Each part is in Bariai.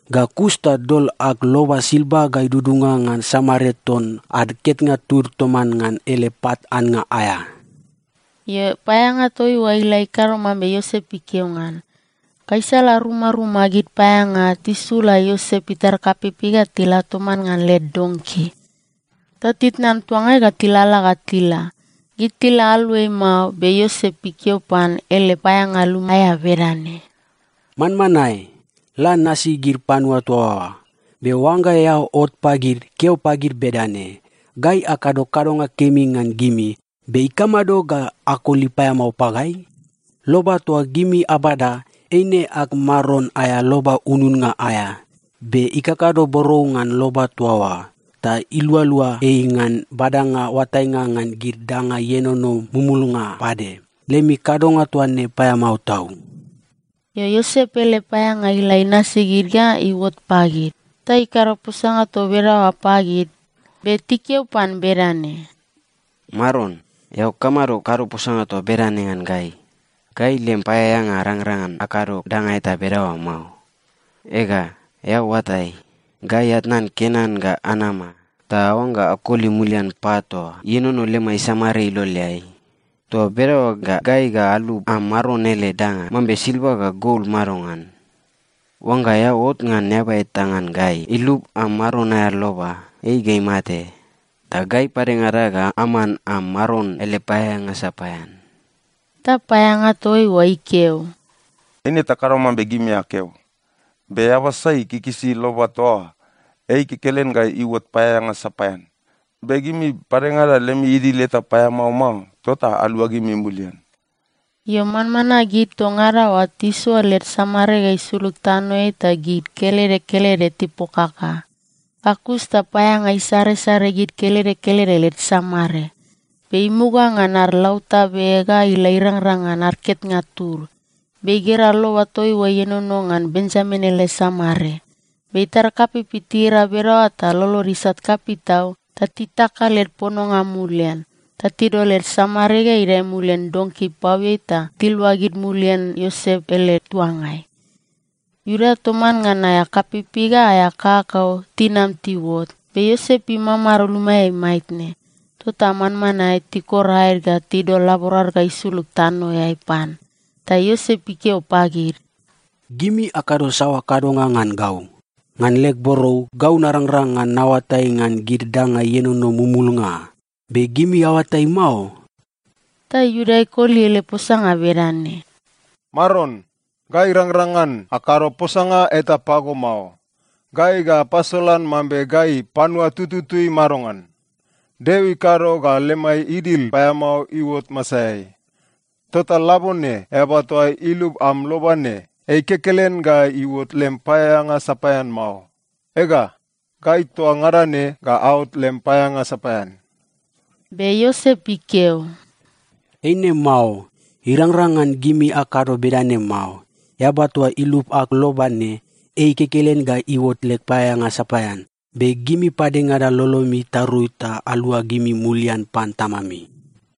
Ga kus ta dol ag loba silva ga idudunga ngan samare ton ad ketnga tud toman ngan ele pat annga aea.” Io, paeaeanga toa oa ila ikado mambe Iosep ikeo ngan. Gaisala rumaruma gid paeaeanga tisula Iosep itar kapeipei ga tila toman ngan led donki. Ta titnan tuanga ga tilalala ga tila. Gid tila aluai mao, be Iosep ikeo pan ele paeaeanga luma aea bedane, “Manmanae, la nasi gid panua toa oa. Be oangga eao ot pagid, keo pagid bedane, ‘Gai akado kadonga kemi ngan gimi, be ikamado ga akoli paeamao pagai? Loba toa gimi abada, eine ag maron aea loba ununnga aea. Be ikakado borou ngan loba toa oa, ta ilualua ei ngan badanga oatainga ngan gid danga ienono mumulnga pade. Lemi kadonga toa ne paeamao tau.’” Io, Iosep ele paeaeanga ila inasi gid ga iuot pagid, ta ikado posanga toa bedaoa pagid. Be tikeo pan bedane, “Maron, eao kamado kado posanga toa bedane ngan gai? Gai lem paeaeanga arangrang ngan akado danga eta bedaoa mao. Ega, eao oatai, gai atnan Kenan ga anama ta aoangga akoli mulian pat toa ienono lemai samare iloleai. Toa bedaoa ta gai ga alub am maron ele danga mambe silva ga gol madongan? Oangga eao ot ngan eaba eta ngan gai ilub am maron aea loba, ei ga imate, ta gai padengada ga aman am maron ele paeaeanga sapaean.” Ta paeaeanga toa oa ikeo, “Eine takado mambe gimi akeo. Be eaba sai ikikisi loba toa oa, ei kekelen ga iuot paeaeanga sapaean. Be gimi padengada lemi idil eta paeamao mao, tota aluagimi mulian.” Io, manmanae gid toa ngada oa tisoa led samare ga isulug tanoeai ta gid kelede kelede tipokaka. Ga kus ta paeaeanga isaresare gid kelede kelede led samare, be imuga ngan ad lautabe ga ila irangrang ngan ad ketnga tud. Be igera loba toa oa ienono ngan Benjamin ele samare. Be itar kapeipei tigera bedaoa ta lolod isat kapei tau ta titaka led pononga mulian. Ta tidol led samare ga idae mulian donki ipaoeai ta tiluagid mulian Iosep ele tuangai. Iuda toman ngan aea kapeipei ga aea kakakau tinam tiuot, be Iosep imamado lumaeai maitne. Tota manmanae tikor aed ga tidol laborad ga isulug tanoeai pan. Ta Iosep ikeo pagid, “Gimi akado saoa kadonga ngan gau? Ngan leg borou, gau narangrang ngan naoatai ngan gid danga ienono mumulnga, be gimi aoatai mao?” Ta Iuda ikoli ele posanga bedane, “Maron, gai arangrang ngan akado posanga eta pago mao. Gai ga apasolan mambe gai panua tututui madongan? Deo ikado ga lemai idil paeamao iuot masaeai. Tota labone, eaba toa ilub am loba ne, ei kekelen ga iuot lem paeaeanga sapaean mao. Ega, gai toa ngada ne ga aot lem paeaeanga sapaean.” Be Iosep ikeo, “Eine mao. Irangrang ngan gimi akado bedane mao. Eaba toa ilub ag loba ne, ei kekelen ga iuot leg paeaeanga sapaean. Be gimi padengada lolomi itarui ta aluagimi mulian pan tamami.”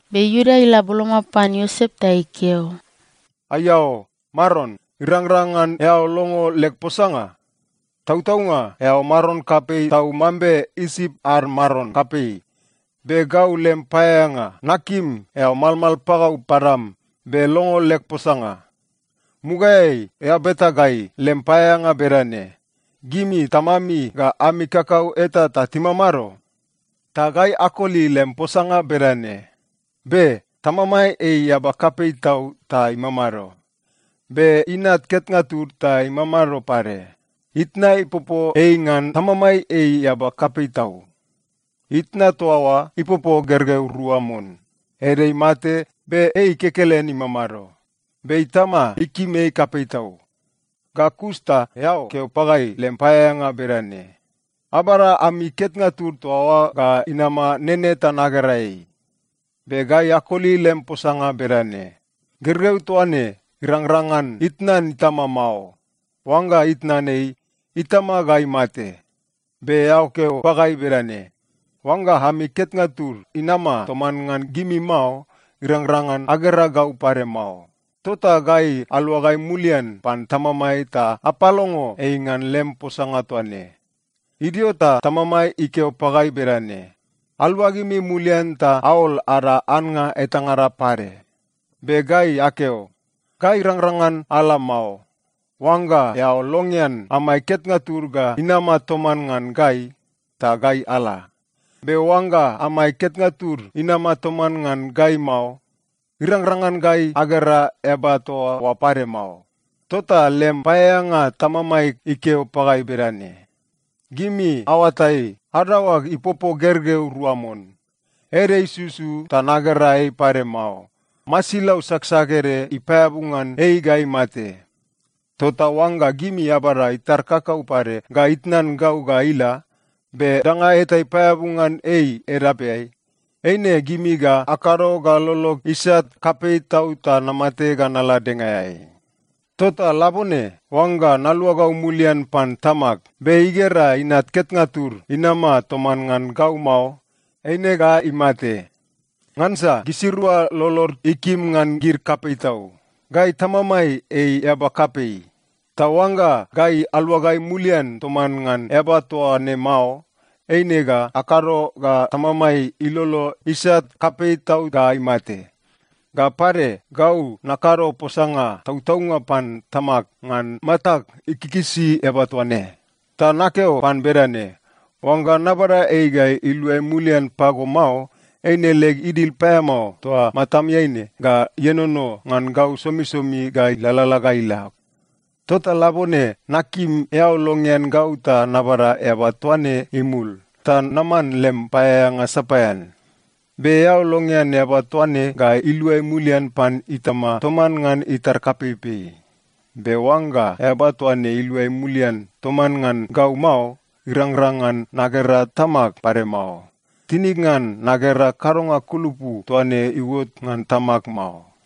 Be Iuda ila boloma pan Iosep ta ikeo, “Aiao, maron! Irangrang ngan eao longo leg posanga? Tautaunga, eao maron kapei tau mambe Isip ad maron kapei, be gau, lem paeaeanga, nakim eao malmal pagau padam be longo leg posanga. Mugaeai eao beta gai, lem paeaeanga bedane, ‘Gimi tamami ga ami kakau eta ta timamado?’ Ta gai akoli lem posanga bedane, ‘Be. Tamamai ei eaba kapei tau ta imamado. Be inat ketnga tud ta imamado pade. Itna ipopo ei ngan tamamai ei eaba kapei tau. Itna toa oa ipopo gergeu rua mon. Ede imate, be ei kekelen imamado. Be itama ikim ei kapei tau.’ “Ga kus ta eao keo pagai, lem paeaeanga bedane, ‘Abada ami ketnga tud toa oa ga inama nene ta nagera ei.’ Be gai akoli lem posanga bedane, ‘Gergeu toa ne irangrang ngan itnan itama mao. Oangga itnan ei, itama ga imate.’ Be eao keo pagai bedane, ‘Oangga ami ketnga tud inama toman ngan gimi mao, irangrang ngan agera gau pade mao.’ Tota gai aluagai mulian pan tamamai ta apalongo ei ngan lem posanga toa ne. “Idio ta tamamai ikeo pagai bedane, ‘Aluagimi mulian ta aol ada annga etangada pade.’ Be gai akeo, ‘Gai arangrang ngan ala mao. Oangga eao longean amai ketnga tud ga inama toman ngan gai, ta gai ala. Be oangga amai ketnga tud inama toman ngan gai mao, irangrang ngan agera eaba toa oa pade mao.’ “Tota lem paeaeanga tamamai ikeo pagai bedane, ‘Gimi aoatai, adaoag ipopo gergeu rua mon. Ede isusu ta nagera ei pade mao. Masilau saksak ede ipaeabu ngan ei ga imate. Tota oangga gimi abada itar kakau pade ga itnan gau ga ila, be danga eta ipaeabu ngan ei edapeai, eine gimi ga akado ga lolog isat kapei tau ta namate ga nala dengaeai.’ “Tota labone, oangga naluagau mulian pan tamag, be igera inat ketnga tud inama toman ngan gau mao, eine ga imate. Ngansa gisirua lolod ikim ngan gid kapei tau. Gai tamamai ei eaba kapei. Ta oangga gai aluagai mulian toman ngan eaba toa ne mao, eine ga akado ga tamamai ilolo isat kapei tau ga imate. Ga pade, gau nakado posanga tautaunga pan tamag ngan matag ikikisi eaba toa ne. Ta nakeo pan bedane, ‘Oangga nabada ei ga iluai mulian pago mao, eine leg idil paeamao toa matameai ne ga ienono ngan gau somisomi ga ilalala ga ila.’ “Tota labone nakim eao longean gau ta nabada eaba toa ne imul, ta naman lem paeaeanga sapaean. Be eao longean eaba toa ne ga iluai mulian pan itama toman ngan itar kapeipei. Be oangga eaba toa ne iluai mulian toman ngan gau mao, irangrang ngan nagera tamag pade mao. Tinig ngan nagera kadonga kulupu toa ne iuot ngan tamag mao.”